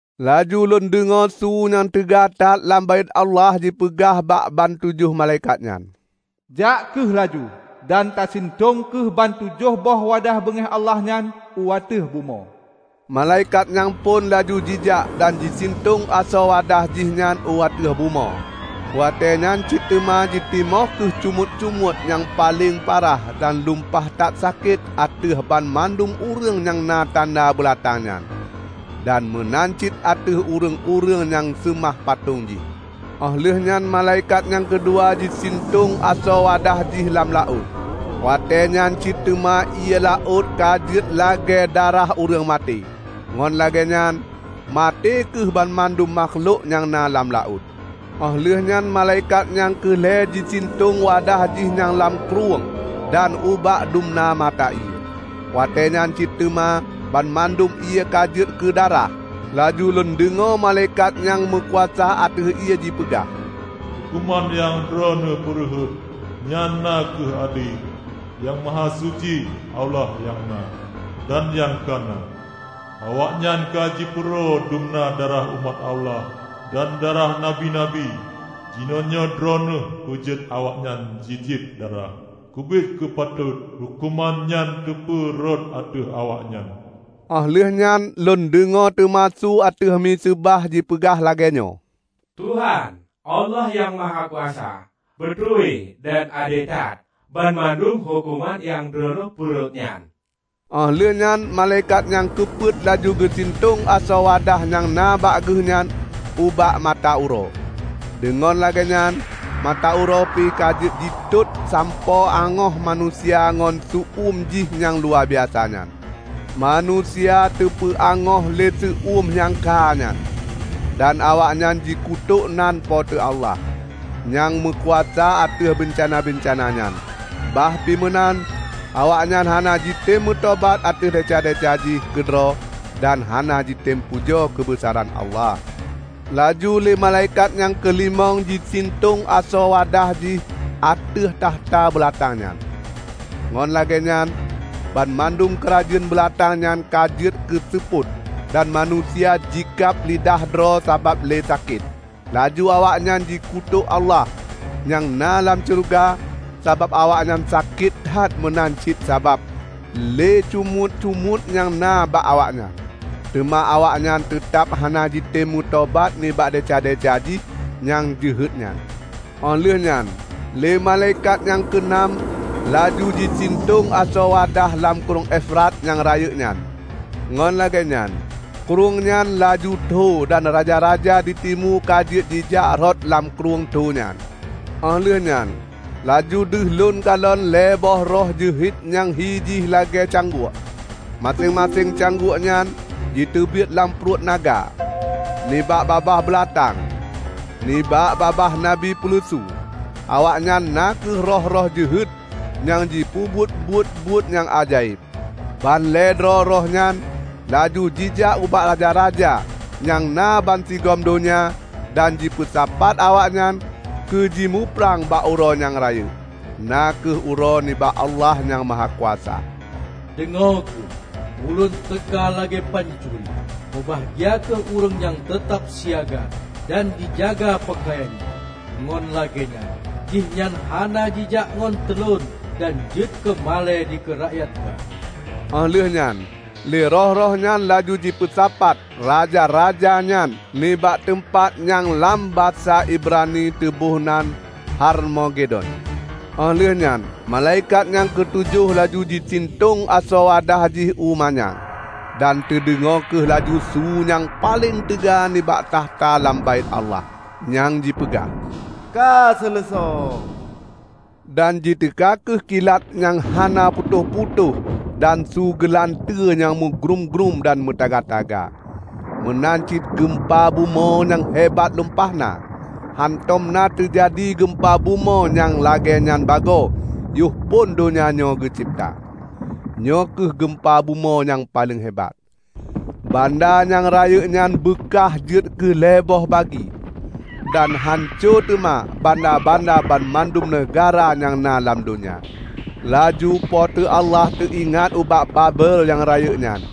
Laju lôn deungoe su nyang teuga that lam Baét Allah jipeugah bak ban tujoh malaikat nyan, "Jak kheueh laju dan tasintong kheueh ban tujoh boh wadah beungéh Allah nyan u ateueh bumoe!" Malaikat nyang phon laju jijak dan jisintong asoe wadah jihnyan u ateueh bumoe. Watée nyan cit teuma jitimoh kheueh cumuet-cumuet nyang paleng parah dan lumpah that sakét ateueh banmandum ureuëng nyang na tanda beulatang nyan, dan meunan cit ateueh ureuëng-ureuëng nyang seumah patong jih. Óh lheueh nyan malaikat nyang keudua jisintong asoe wadah jih lam laôt. Watée nyan cit teuma ié laôt ka jeuet lagée darah ureuëng maté, ngon lagée nyan maté kheueh banmandum makhlok nyang na lam laôt. Óh lheueh nyan malaikat nyang keu lhée jisintong wadah jih nyan lam krueng dan ubak dumna mata ié, watéenyan cit teuma banmandum ié ka jeuet keudarah. Laju lôn deungoe malaikat nyang meukuasa ateueh ié jipeugah, "Huköman nyang Droeneueh peurhot nyan na kheueh ade, Nyang Mahasuci, Allah nyang na, dan nyang ka na! Awaknyan ka jipeuro dumna darah umat Allah dan darah nabi-nabi; jinoenyoe Droeneueh peujeuet awaknyan jijieb darah. Keubiet ka patot huköman nyan teupeu rhot ateueh awaknyan!" Óh lheueh nyan lôn deungoe teuma su ateueh miseubah jipeugah lagée nyoe, "Tuhan, Allah Nyang Mahakuasa, beutôi dan ade that banmandum huköman nyang Droeneueh peurhot nyan!" Óh lheueh nyan malaikat nyang keupeuet laju geusintong asoe wadah nyang na bak geuhnyan ubak mata uroe, deungon lagée nyan mata uroe pih ka jeuet jitot sampoe angoh manusia ngon seu-eum jih nyang luwabiasa nyan. Manusia teupeu angoh lé seu-eum nyang kha nyan, dan awaknyan jikutok nan Po teu Allah, nyang meukuasa ateueh beuncana-beuncana nyan. Bah pih meunan, awaknyan hana jitem meutobat ateueh desya-desya jih keudroe dan hana jitem pujoe keubeusaran Allah. Laju lé malaikat nyang keulimong jisintong asoe wadah jih ateueh takhta beulatang nyan. Ngon lagée nyan banmandum keurajeuen beulatang nyan ka jeuet keuseupôt, dan manusia jikab lidah droe sabab lé sakét. Laju awaknyan jikutok Allah nyang na lam syeuruga sabab awaknyan sakét that meunan cit sabab lé cumuet-cumuet nyang na bak awaknyan. Teuma awaknyan teutab hana jitem meutobat nibak desya-desya jih nyang jeuhet nyan. Óh lheueh nyan lé malaikat nyang keu nam laju jisintong asoe wadah lam Krueng Efrat nyang rayeuk nyan. Ngon lagée nyan krueng nyan laju tho dan raja-raja di timu ka jeuet jijak rot lam krueng tho nyan. Óh lheueh nyan laju deuh lôn kalon lhée boh roh jeuhet nyang hi jih lagée cangguek. Maséng-maséng cangguek nyan jiteubiet lam pruet naga, nibak babah beulatang, nibak babah nabi peuleusu. Awaknyan na kheueh roh-roh jeuhet nyang jipeubuet buet-buet nyang ajaéb. Ban lhée droe roh nyan laju jijak ubak raja-raja nyang na bansigom donya dan jipeusapat awaknyan keu ji muprang bak Uroe nyang rayeuk, na kheueh Uroe nibak Allah Nyang Mahakuasa. "Deungoe kheueh! Ulôn teuka lagée pancuri! Meubahgia kheueh ureuëng nyang teutab siaga dan jijaga peukayan jih, ngon lagée nyan jihnyan hana jijak ngon teulon dan jeuet keu malée dikeue rakyat ba!" Óh lheueh nyan lé roh-roh nyan laju jipeusapat raja-raja nyan nibak teumpat nyang lam basa Ibrani teuboh nan Harmagedon. Óh lheueh nyan malaikat nyang keutujoh laju jisintong asoe wadah jih u manyang. Dan teudeungoe kheueh laju su nyang paleng teuga nibak takhta lam Baét Allah, nyang jipeugah, "Ka seuleusoe!" Dan jiteuka kheueh kilat nyang hana putôh-putôh dan su geulanteue meugrúm-grúm dan meutaga-taga, meunan cit geumpa bumoe nyang hebat lumpah na. Hántom na teujadi geumpa bumoe nyang lagée nyan bagoe yoh phon donya nyoe geucebta. Nyoe kheueh geumpa bumoe nyang paleng hebat! Banda nyang rayeuk nyan beukah jeuet keu lhée boh bagi, dan hanco teuma banda-banda banmandum neugahra nyang na lam donya. Laju Po teu Allah teuingat ubak Babel nyang rayeuk nyan.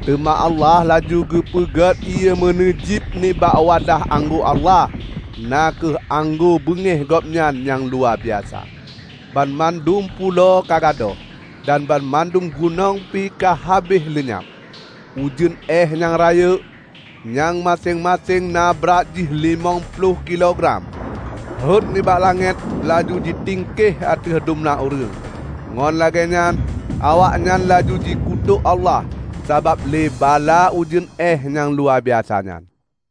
Teuma Allah laju geupeugét ié meuneujiéb nibak wadah anggô Allah -- na kheueh anggô beungéh Gobnyan nyang luwabiasa. Banmandum pulo ka gadôh, dan banmandum gunong pih ka habéh leunyab. Ujeuen éeh nyang rayeuk, nyang maséng-maséng na brat jih limong ploh kilo gram, rhot nibak langét laju jitingkeh ateueh dumna ureuëng. Ngon lagée nyan awaknyan laju jikutok Allah sabab lé bala ujeuen éeh nyang luwabiasa nyan.